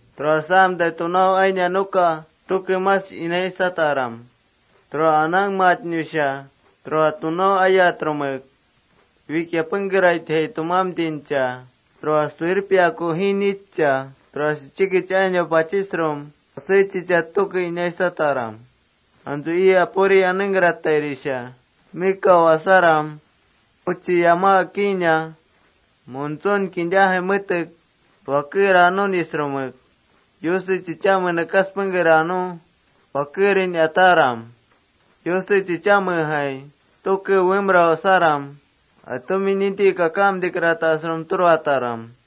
Tura asamtai tunau ainia nuka mash inaisaram, anangmatnusha tura tunau ayatrumek: Wikia pengkeraitjai tumamtincha, tura suwirpiaku jiinitcha, tura chikich ainau pachisrum pasé chichat tuke inaisataram. Antsu ii Apuri pengkeraitai tusaram nekau asaram, uchi yama akiina muntsun kintajai metek wakera nunisrumek, Yuse chichame nekas pengker aa nu wakerin ataram. Yuse chichamejai tuke uwemrau asaram, atumi ninti kakamtikratasrum turataram.+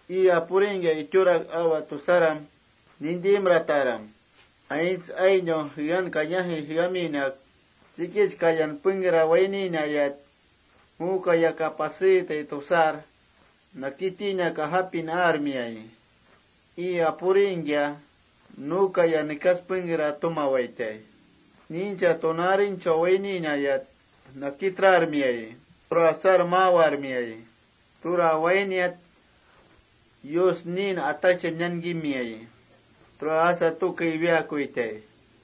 Ii Apuringkia itiurak awa tusaram nintimrataram. Aints ainau jean kayajai jeaminak chikich kayan pengkeran wainkariat: Ju kayaka paseetai tusar, nakitinak ajapawarmiayi. Ii Apuringkia nu kaya nekas pengkera tumawaitai. Niincha tunaarinchau waininayat nakitrarmiayi. Tura wainiat Yus niin ataksha inankimiayi. Tura asa tuke iwiaakuitai.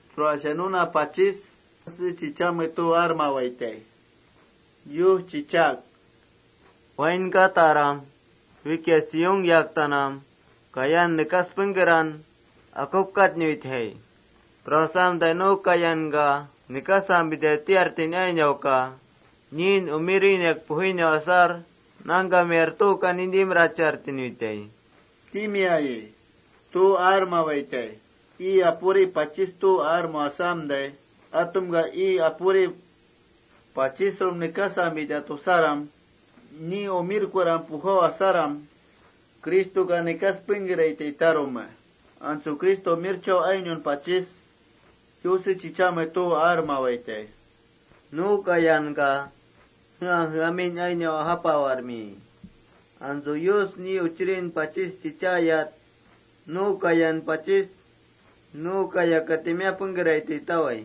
Tura nuna pachis Yuse chichame tu aarmawaitai. Yus chichaak: “Wainkataram. Wikia Sión yaktanam kaya juuntan pujsatnuitjai. Tura asamtai nu kayanka nekasampita tiartin ainauka niin umirinau asar pengké natsaarchartinuitai,” timiayi.+ Tu aarmawaitai. Ii Apurin pachis tu aarmau asamtai, atumka ii Apuri nekasampita tinu asaram, Cristoka nekas pengkeraitai tarume. Antsu Cristo umirchau ainaun pachis Yuse chichame tu aarmawaitai: “Jea jeamin ainau kayanka ajapawarmiayi. Antsu Yus ni Uchirin tayat nu kayanka pachis: Nuka timiá pengkeraitai,” tawai.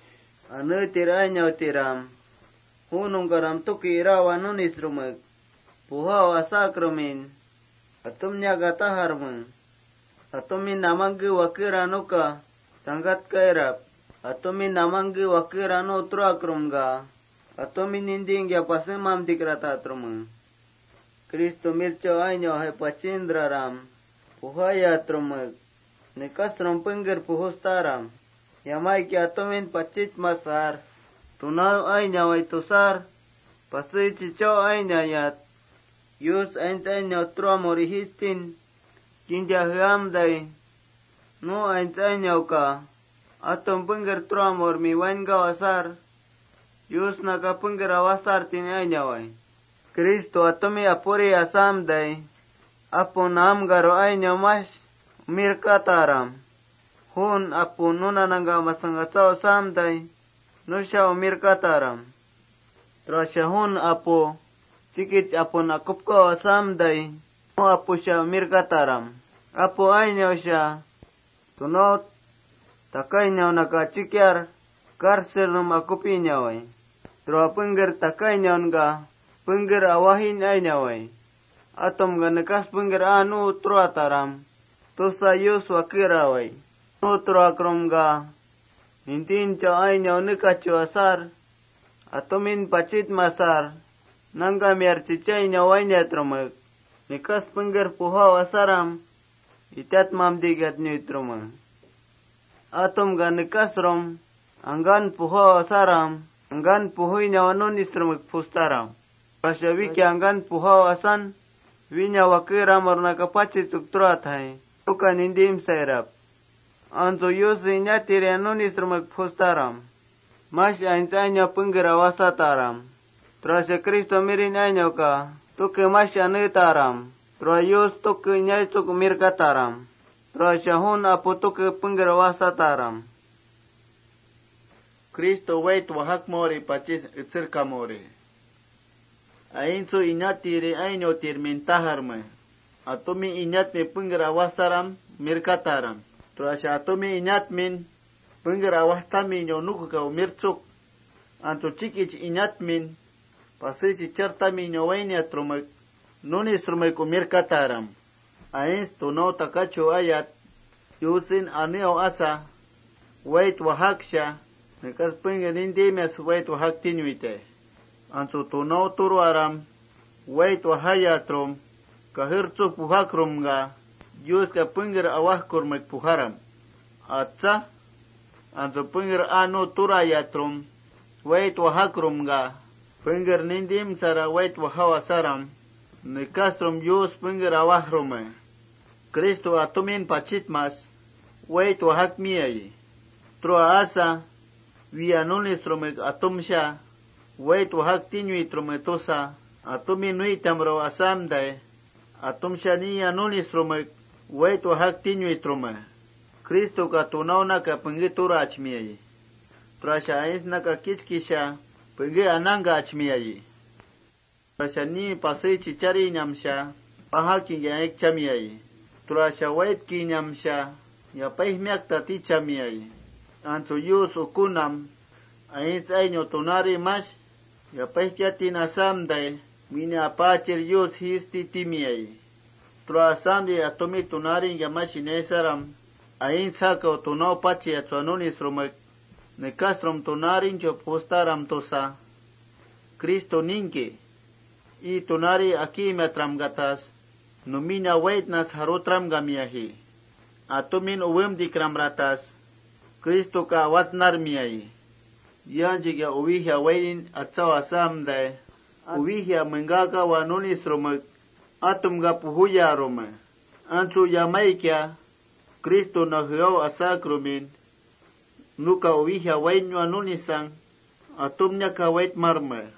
Aneetir ainautiram, ju nungkanam tuke iraawa nunisrumek pujau asakrumin atumniaka tajarme: Atumi namangke wakera nuka tsangkatkairap. Nu turakrumka atumi nintingkia pasemamtikratnuitrume. Cristo umirchau ainaujai pachintraram pujayatrumek, nekasrum pengker pujustaram. Yamaikia atumin pachitmasar: Tunau ainawai tusar pasé chichau ainayat, Yus nu aints ainau turamurin jiistin kinta jeamtai, nu aints ainauka atum pengker turamurmin wainkau asar, Yusnaka pengker awajsartin ainawai.+ Cristo atumi Apuri asamtai, apu naamkaru ainau mash umirkataram. Juun apu nuna nangkamasang atsau asamtai nusha umirkataram. Tura juun apu chikich apun akupkau asamtai, nu apusha umirkataram. Apu ainauka tunau takau ainaunaka achikiar kársernum akupinawai. Tura pengker takau ainaunka pengker awajin ainawai. Atumka nekas pengker aa nu turataram tusa Yuska wakerawai. Nu turakrumka nintinchau ainau nekachu asar, atumin pachitmasar nangkamiar chichainau asaramtai, nekas pengker pujau asaram itatmamtikiatnuitrume. Atumka nekasrum angkan pujau asaram, angkan pujuinawa nunisrumek pujustaram. Tura wikia angkan pujau asan, wína wakeramurnaka pachitsuk turatatjai, tuuka nintimsairap. Antsu Yuse inatiriya nunisrumek pujustaram. Mash aints ainau pengker awajsataram. Tura Cristonu ainauka aneetaram. Tura Yuska umirkataram. Tura juun apu pengker awajsataram tajarme. Aintsu inatiri ainautirmin tajarme: Atumi inatmin pengker awajsaram tuke umirkataram. Tura atumi inatmin pengker awajtaminauk umirtsuk, antsu chikich inatmin pasé chichartaminau wainiatrumek umirkataram. Tura aints tunau takachu ayat, Yusen aneau asa wait wajaksha, nekas pengker nintimias wait wajakminuitai. Antsu tunau turaram jaimiasrumek wait wajakrumka ¿Yuska pengker awajkurmek pujaram? Atsa. Antsu pengker aa nu turayatrum wait wajakrumka, jaimiasrum wait wajau asaram, nekasrum Yuska pengker awajrume. Cristo atumin pachitmas wait wajakmiayi. Tura asa: Wiya nunisrumek atumsha wait wajaktinuitrume tusa, atumin nuitamrau asamtai, atumsha niya nunisrumek wait wajaktinuitrume. Cristoka tunaunaka pengké turachmiayi. Tura aintsnaka kichkisha pengké anangkachmiayi.+ Tura niin pasé chicharinamsha, pajaki aikchamiayi. Tura waitkinamsha yapaijmiaktaj tichamiayi. Antsu Yus ukunam aints ainau tunaarin mash yapaijkiatin asamtai, wína Apaachir Yus jiisti timiayi.+ Tura asamtai atumi tunaaringkia mash inaisaram, aints jakau tunau pachiatsua nunisrumek tunaarinchau pujustaram tusa, Cristo ningki ii tunaarin akiimiatramkatas numinam waitnas jarutramkamiaji. Atumin uwemtikramratas Cristoka awatnarmiayi.+ Yaanchuikia atumin waitmaktin atsau asamtai, uwija mengkakawa nunisrumek atumka pujuyarme. Antsu yamaikia Cristonam jeau asakrumin, nuka uwija wainua nunisang atumin waitmarme.+